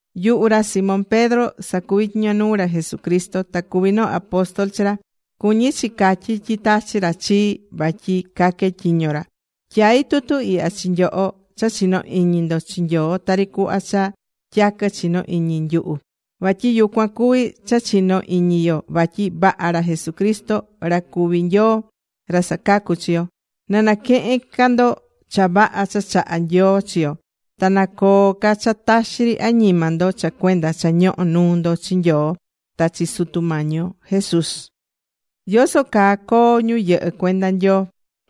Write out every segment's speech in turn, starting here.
Yuhu ra Simón Pedro sacuví tyiño nuu ra Jesucristo. Ta cuví noo apóstol chi ra. Cuñí chi catyí tyi tachi̱ ra chii vatyi caque tyiño ra. Tyaí tutu ihya chi nyoho cha chinó iñi ndo chi Nyoo tari cuhva cha tyaquɨ chinó iñi nyuhu. Vatyi yucuan cuví cha chino iñi yo vatyi vaha ra Jesucristo, ra cuví Nyoo, ra sacacú chi yo. Na naquehen ca ndo cha vaha cha chahá Nyoo chi yo. Ta na coo ca cha taxi ri añima ndo cha cuenda cha ñohó nuu ndo chi Nyoo ta chi Sutu Mañi yo Jesús.Yoso caa coo ñu yɨhɨ́ cuenda Nyoo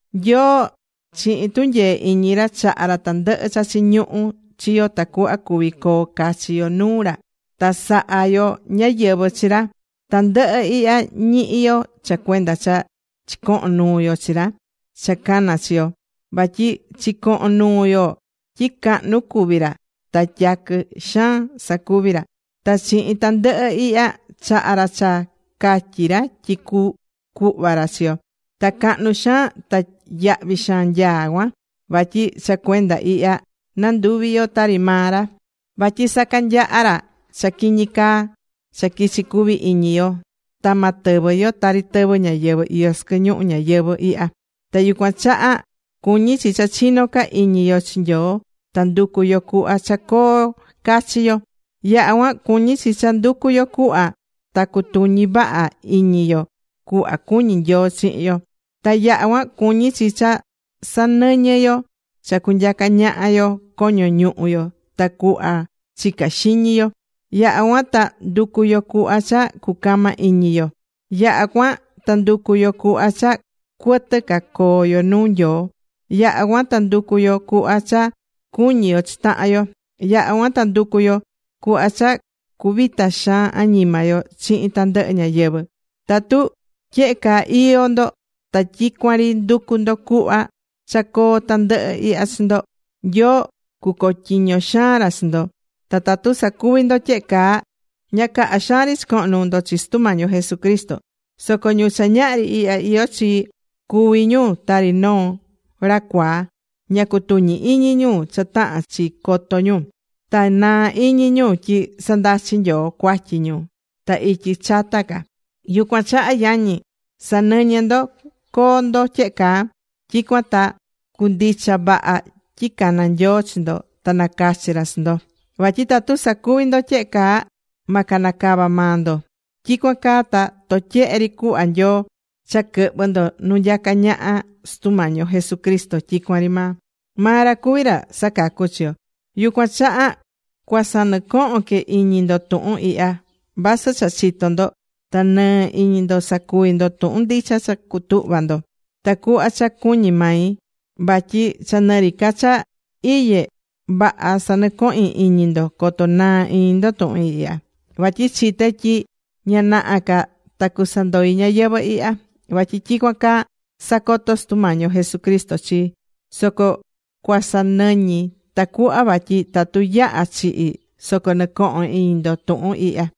Nyoo chihin tunyee iñi ra, chaha̱ ra tandɨhɨ cha chiñuhú chi yo tacuhva cuvi coo cachi yo nuu ra ta saha yo ñáyɨvɨ chi ra. Tandɨhɨ ihya ñihí yo cha cuenda cha chicohon nuu yo chi ra cha cana̱ chi yo. Vatyi chicohon nuu yo tyi cahnu cuví ra ta tyaquɨ xaan cha sacuví ra. Ta chihin tandɨhɨ ihya, chaha̱ ra cha catyi̱ ra tyi cucuhva ra chi yo. Ta cahnu xaan ta yahvi xaan nyaá cuan. Vatyi cha cuenda ihya nanduvi yo tari maa ra. Vatyi sacanyaha ra cha quiñi caa cha quichi̱ cuvi iñi yo, ta ma tɨvɨ yo tari tɨvɨ́ ñáyɨvɨ iyó sɨquɨ ñuhu ñayɨvɨ̱ ihya. Ta yucuan chaha cuñí chi cha chinó ca iñi yo chi Nyoo ta nducu yo cuhva cha coo cachi yo. Yaha cuan cuñí chi cha nducu yo cuhva ta cutuñi vaha iñi yo cuhva cuñi Nyoo chihin yo. Ta yaha cuan cuñí chi cha sanɨñɨ yo cha cunyaca ñaha yo coño ñuhu yo ta cuhva chicá xiñi yo. Yaha cuan ta ndu̱cu yo cuhva cha cucama iñi yo. Yaha cuan ta ndu̱cu yo cuhva cha cuɨtɨ ca coo yo nuu Nyoo. Yaha cuan ta ndu̱cu yo cuhva cha cuñi yo chi tahan yo. Yaha cuan ndu̱cu yo cuhva cha cuvita xaan añima yo chihin tandɨhɨ ñáyɨvɨ. Tatu tyehe caa iyó ndo ta tyicuan ri nducú ndo cuhva cha coo tandɨhɨ ihya chi ndo, Nyoo cucotyiño xaan ra chi ndo. Ta tatu sacuvi ndo tyehe caa, ña caha xaan ri chicoho̱n nuu ndo chi Sutu Mañi yo Jesucristo. Soco ñu cha ñahri ihya iyó chi, cuví ñu tari noo ra cuaa. Ña cutuñi iñi ñu cha tahán chi coto ñu. Ta naa̱ iñi ñu tyi sandachi̱ Nyoo cuatyi ñu ta ityi chata ca. Yucuan chaha yañi, sa̱nɨñɨ ndo coo ndo tyehe caa. Tyicuan ta cundicha vaha tyi cana̱ Nyoo chi ndo ta nacachi̱ ra chi ndo. Vatyi tatu sacuví ndo tyehe caa, ma canacava maa ndo. Tyicuan caa ta totyehe ri cuhva Nyoo cha quɨhvɨ ndo nu nyacá ñaha Sutu Mañi yo Jesucristo tyicuan ri maa. Maa ra cuvi ra sacacú chi yo. Yucuan chaha cuasanɨcohon que iñi ndo tuhun ihya, vasɨ cha chitó ndo, ta nɨɨ iñi ndo sacuví ndo tuhun ndicha cha cutuhva ndo. Ta cuhva cha cuñí mai, vatyi cha nɨ ri ca cha iyé, vaha sanɨcohin iñi ndo coto naa iñi ndo tuhun ihya. Vatyi chité tyi ña naha ca ta cusandoi ñayɨvɨ̱ ihya. Vatyi tyicuan caa sacoto̱ Sutu Mañi yo Jesucristo chii. Soco cuasanɨñi tacuhva vatyi tatu yaha̱ chihi̱ soco nɨcohón iñi ndo tuhun ihya.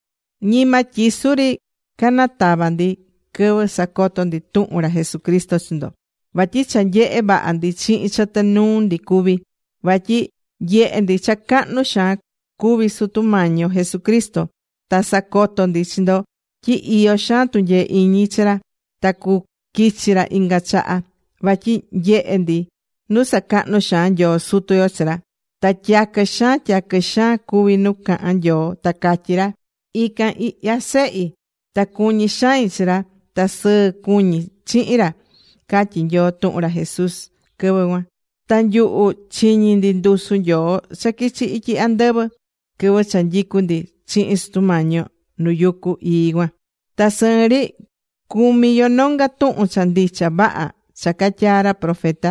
Ñima tyisu ri canatava̱ ndi quɨvɨ sacoto ndi tuhun ra Jesucristo chi ndo. Vatyi cha nyehe̱ vaha ndi chihin chɨtɨ nuu ndi cuví. Vatyi nyehe̱ ndi cha cahnu xaan cuví Sutu Mañi yo Jesucristo. Ta sacoto̱ ndi chi ndo tyi iyó xaan tunyee iñi chi ra ta cuquichi ra inga chaha. Vatyi nyehe̱ ndi nu sacahnu̱ xaan Nyoo Sutu yo chi ra. Ta tyaquɨ xaan tyaquɨ xaan cuvi̱ nu cahan Nyoo ta catyí ra: “Ican ihya Sehi. Ta cuñí xain chi ra. Ta sɨɨ cuñí chihin ra”, catyí Nyoo tuhun ra Jesús quɨvɨ cuan. Ta nyuhu chiñi̱ ndi ndusu Nyoo cha quichi̱ ityi andɨvɨ quɨvɨ cha nyicú ndi chihin Sutu Mañi yo nu yucu ii cuan. Ta sɨɨn ri cumí yo nonga tuhun cha ndicha vaha cha catyaa̱ ra profeta.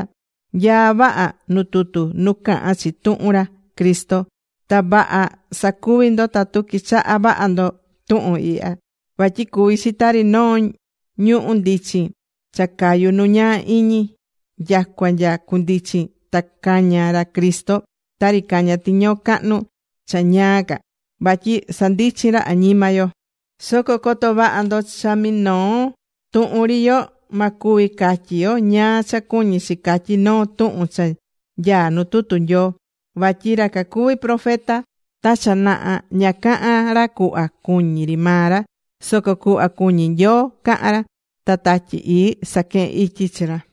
Nyaá vaha nu tutu nu cahán chi tuhun ra Cristo. Ta vaha sacuví ndo tatu quichahá vaha ndo tuhun ihya. Vatyi cuví chi tari noo ñuhu̱ ndichin cha cayú nu ñaa iñi nyacua nya cundichin ta caña ra Cristo tari cañá tiñoo cahnu cha ñaa ca, vatyi sandichín ra añima yo. Soco co̱to vaha ndo vatyi cha minoo tuhun ri yo, ma cuvi catyi yo ñáá cha cuñí chi catyí noo tuhun cha nyaá nu tutu Nyoo. Vatyi ra cacuvi profeta ta cha naha, ña caha̱n ra cuhva cuñí ri maa ra. Soco cuhva cuñí Nyoo caha̱n ra. Ta Tatyi Ii saquehe̱n ityi chi ra.